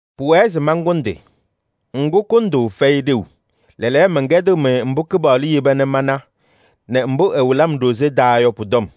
Pʋwɛɛ se mankʋndɩ. Ŋgʋ, kʋndʋʋ fɛyɩ ɖeu. Lɛɛlɛɛyɔ, mɛnkɛdɩɣ-mɩ mbʋ Kɩpaɣlʋ yeba nɛ mana nɛ mbʋ ɛwɩlɩ-m ɖozee taa yɔ pʋ-tɔm.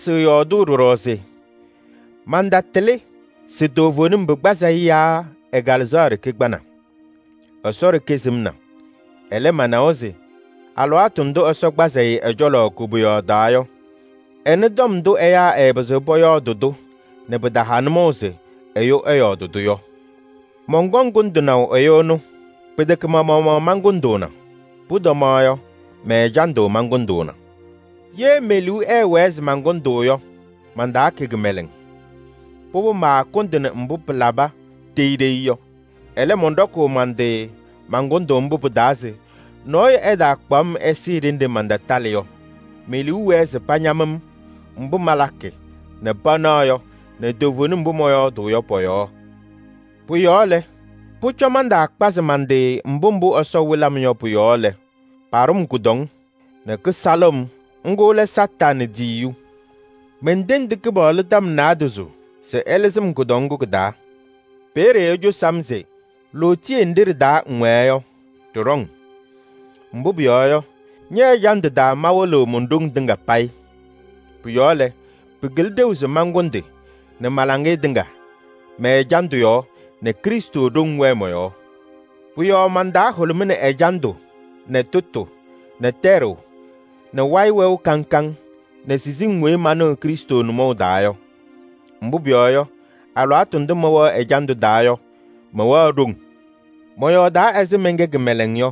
Mantasɩɣ yɔɔdʋʋ ɖɔɖɔ se: mantatɩlɩ se toovenim pɩkpazɩ-ɩ yaa ɛ-kalɩzaɣ ɖeke kpana. Ɛsɔ ɖeke sɩmna. Ɛlɛ, manawa se: alɩwaatʋ ndʋ Ɛsɔ kpazɩ-ɩ ɛ-cɔlɔ koboyaɣ taa yɔ, ɛnɩ tɔm ndʋ ɛyaa ɛɛpɩzɩɣ pɔyɔɔdɩ-tʋ nɛ pɩtaha nʋmɔʋ se ɛyʋ ɛyɔɔdɩ-tʋ yɔ. Mɔnkɔŋ kʋndɩnaʋ ɛyʋ ɛnʋ. Pɩtɛkɛ ma-maɣmaɣ mankʋndʋʋna. Pʋtɔmaɣ yɔ, mɛ-ɛjandʋ mankʋndʋʋna. Ye me-liu ɛɛwɛɛ se mankʋndʋʋ yɔ, mantaakɛ kɩmɛlɛŋ. Pʋbʋ maakʋndɩnɩ mbʋ pɩlabɩ ɖeyi ɖeyi yɔ. Ɛlɛ, mɔnɖɔkʋʋ man-tɩ man-kʋndʋʋ mbʋ pɩ-taa se nɔɔyʋ ɛtaakpaɣ-m ɛsɩɩ ɖenɖe mantatalɩ yɔ. Me-liu wɛɛ se pañam-m mbʋ malakɩ nɛ panaɣ yɔ nɛ toovenim mbʋ mɔyɔɔdʋʋ yɔ pɔ-yɔɔ. Pʋ-yɔɔ lɛ, pʋcɔ mantaakpazɩ man-tɩ mbʋ mbʋ Ɛsɔ wɩlɩ-m yɔ pʋ-yɔɔ lɛ, paɖʋ-m kʋdɔŋ nɛ kɩsalɩɣ-m, ŋgʋ lɛ Satanɩ tiyiyu. Mentendi Kɩpaɣlʋ tɔm naadozo se ɛlɩzɩ-m kʋdɔŋ ŋgʋ kɩ-taa. Peeye ecosi-m se: lootiye nɖɩ ɖɩ-taa ŋwɛɛ yɔ, ɖɩɖɔ-ŋ. Mbʋ pʋyɔɔ yɔ, ñɛ-ɛjandʋ taa mawɩlɩɣ mon-ɖoŋ tɩŋa payɩ. Pʋ-yɔɔ lɛ, pɩkɩlɩ ɖeu se mankʋndɩ nɛ ma-laŋɩyɛ tɩŋa mɛ-ɛjandʋ yɔɔ nɛ Krɩstʋ ɖoŋ wɛɛ mɔ-yɔɔ. Pʋ-yɔɔ man-taa hʋlʋmɩnɩ ɛjandʋ nɛ tʋtʋ nɛ tɛɖʋʋ nɛ wayɩ wɛʋ kaŋ kaŋ nɛ siziŋ weyi manɩɣ Krɩstʋ nʋmɔʋ taa yɔ. Mbʋ pʋyɔɔ yɔ, alɩwaatʋ ndʋ mɛwɛɣ ɛjandʋ taa yɔ mɛwɛɣ ɖoŋ. Mɔyɔɔdaa ɛzɩ mɛnkɛ kɩmɛlɛŋ yɔ: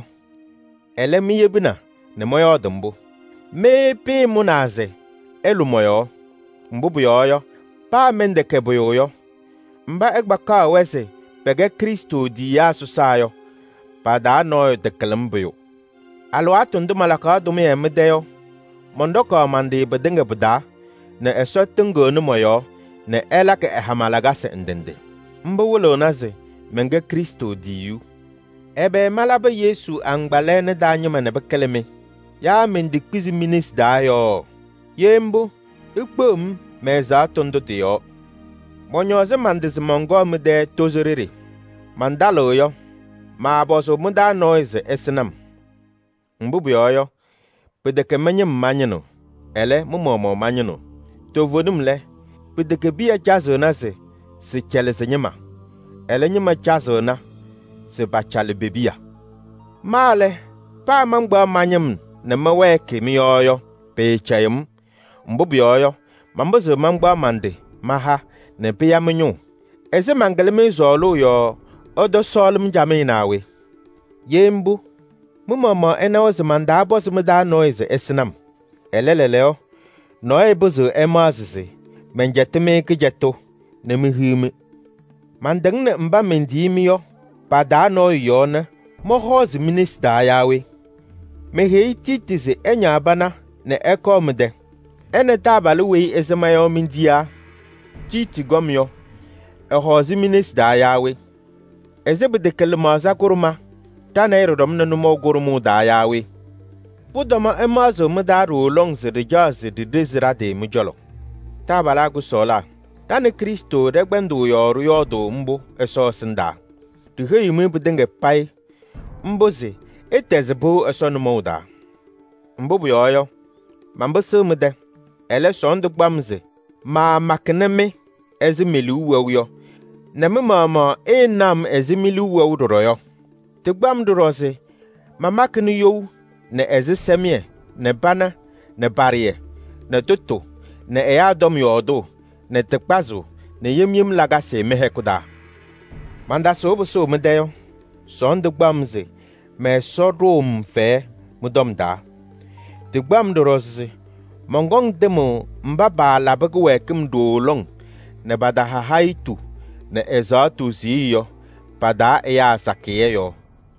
ɛlɛ, miyebina nɛ mɔyɔɔdɩ mbʋ. Mɩ pɩɩmʋnaa se ɩlʋ mɔ-yɔɔ. Mbʋ pʋyɔɔ yɔ, paa mɛntɛkɛ pʋyʋ yɔ, mba ɩkpakaɣ-wɛ se pɛkɛ Krɩstʋ tiyiyaa sɔsaa yɔ, pa-taa nɔɔyʋ takɩlɩ-m pʋyʋ. Alɩwaatʋ ndʋ malakaɣ tʋmɩyɛ mɩ-tɛ yɔ, mɔnɖɔkaɣ man-tɩ pɩtɩŋa pɩ-taa nɛ Ɛsɔ tɩŋɩɣnɩ mɔ-yɔɔ nɛ ɛlakɩ ɛ-hama lakasɩ ndɩ ndɩ. Mbʋ wɩlɩɣna se mɛnkɛ Krɩstʋ tiyiyu. Ɛbɛ malabɩ Yesu agbaa lɛɛna taa ñɩma nɛ pɩkɩlɩ-mɩ? Yaa mentekpizi mi-nesi taa yɔɔ? Ye mbʋ, ikpeɣ-m mɛ-ɛzaɣtʋ ndʋ tɩ-yɔɔ. Mɔñɔɔzɩ man-tɩ se mɔnkɔɔ mɩ-tɛ tozo ɖeɖe. Mantalɩɣ yɔ, maapɔzʋʋ mɩ-taa nɔɔyʋ se ɛsɩnɩ-m. Mbʋ pʋyɔɔ yɔ, pɩtɛkɛ mɩ-ñɩm mañɩnɩɣ, ɛlɛ, mɩ-maɣmaɣ mañɩnɩɣ. Toovenim lɛ, pɩtɛkɛ piya cazɩɣna se sɩcalɩ sɩ-ñɩma, ɛlɛ, ñɩma cazɩɣna se pacalɩ pe-piya. Ma lɛ, paa mankpaɣ ma-ñɩm nɛ mɛwɛɛkɩ mɩ-yɔɔ yɔ, pɩɩcɛyɩɣ-m. Mbʋ pʋyɔɔ yɔ, manpɩzɩɣ mankpaɣ man-tɩ maha nɛ pɩya mɩ-ñʋʋ. Ɛzɩ mankɩlɩ-mɩ sɔɔlʋʋ yɔɔ ɩtɔsɔɔlɩ-m camɩyɛ naa we? Ye mbʋ, mɩ-maɣmaɣ ɩnawa se mantaapɔzɩ mɩ-taa nɔɔyʋ se ɛsɩnɩ-m. Ɛlɛ, lɛɛlɛɛyɔ, nɔɔyʋ pɩzɩɣ ɛmaɣzɩ se ajiitu malaba nɛ mehiɣ-mɩ. Mantɩŋnɩ mba mentiyini-mɩ yɔ pa-taa nɔɔyʋ yɔɔ nɛ mɔhɔɔzɩ mi-nesi taa yaa we? Meheyi Tiiti se ɛñaɣ pana nɛ ɛkɔɔ mɩ-tɛ. Ɛ nɛ taabalʋ weyi ɩsɩma yɔ mentiyaa. Tiiti kɔm yɔ, ɛhɔɔzɩ mi-nesi taa yaa we? Ɛzɩ pɩtɛkɛ lɩmaɣza kʋɖʋma ɖa nɛ ɩ ɖɩɖɔmnɩ nʋmɔʋ kʋɖʋmʋʋ taa yaa we? Pʋtɔma ɩmaɣzaɣ mɩ-taa ɖooo lɔŋ se ɖɩcaɣ se ɖiɖezi ɖa-tɩ mɩ-cɔlɔ. Taabalaa kʋsɔɔlaa, ɖa nɛ Krɩstʋ ɖɩkpɛndaa yɔɔ ɖɩyɔɔdʋʋ mbʋ Ɛsɔ ɛsɩndaa. Ɖiheyiɣ-mɩ pɩtɩŋa payɩ mbʋ se ɩtɛzɩ pɩʋ Ɛsɔ nʋmɔʋ taa. Mbʋ pʋyɔɔ yɔ, manpɩsɩɣ mɩ-tɛ. Ɛlɛ, sɔɔndʋ kpaɣ-m se maamakɩnɩ-mɩ ɛzɩ me-liu wɛʋ yɔ nɛ mɩ-maɣmaɣ ɩɩnaɣ-m ɛzɩ mi-liu wɛʋ ɖɔɖɔ yɔ. Tɩkpaɣ-m ɖɔɖɔ se mamakɩnɩ you nɛ ɛzɩsɛmɩyɛ nɛ pana nɛ paɖaɣyɛ nɛ tʋtʋ nɛ ɛyaa tɔm yɔɔdʋʋ nɛ tɩ kpazʋʋ nɛ yem yem lakasɩ mɩ-hɛkʋ taa. Mantasʋʋ pɩsʋʋ mɩ-tɛ yɔ, sɔɔndʋ kpaɣ-m se mɛ-Ɛsɔ ɖʋʋ-m fɛyɛ mɩ-tɔm taa. Tɩkpaɣ-m ɖɔɖɔ se mɔnkɔŋ tɩmʋʋ mba paalabɩ kɩwɛɛkɩm ɖooo lɔŋ nɛ pataha hayitu nɛ ɛzaɣtʋ siɣye yɔ, pa-taa ɛyaa sakɩyɛ yɔɔ.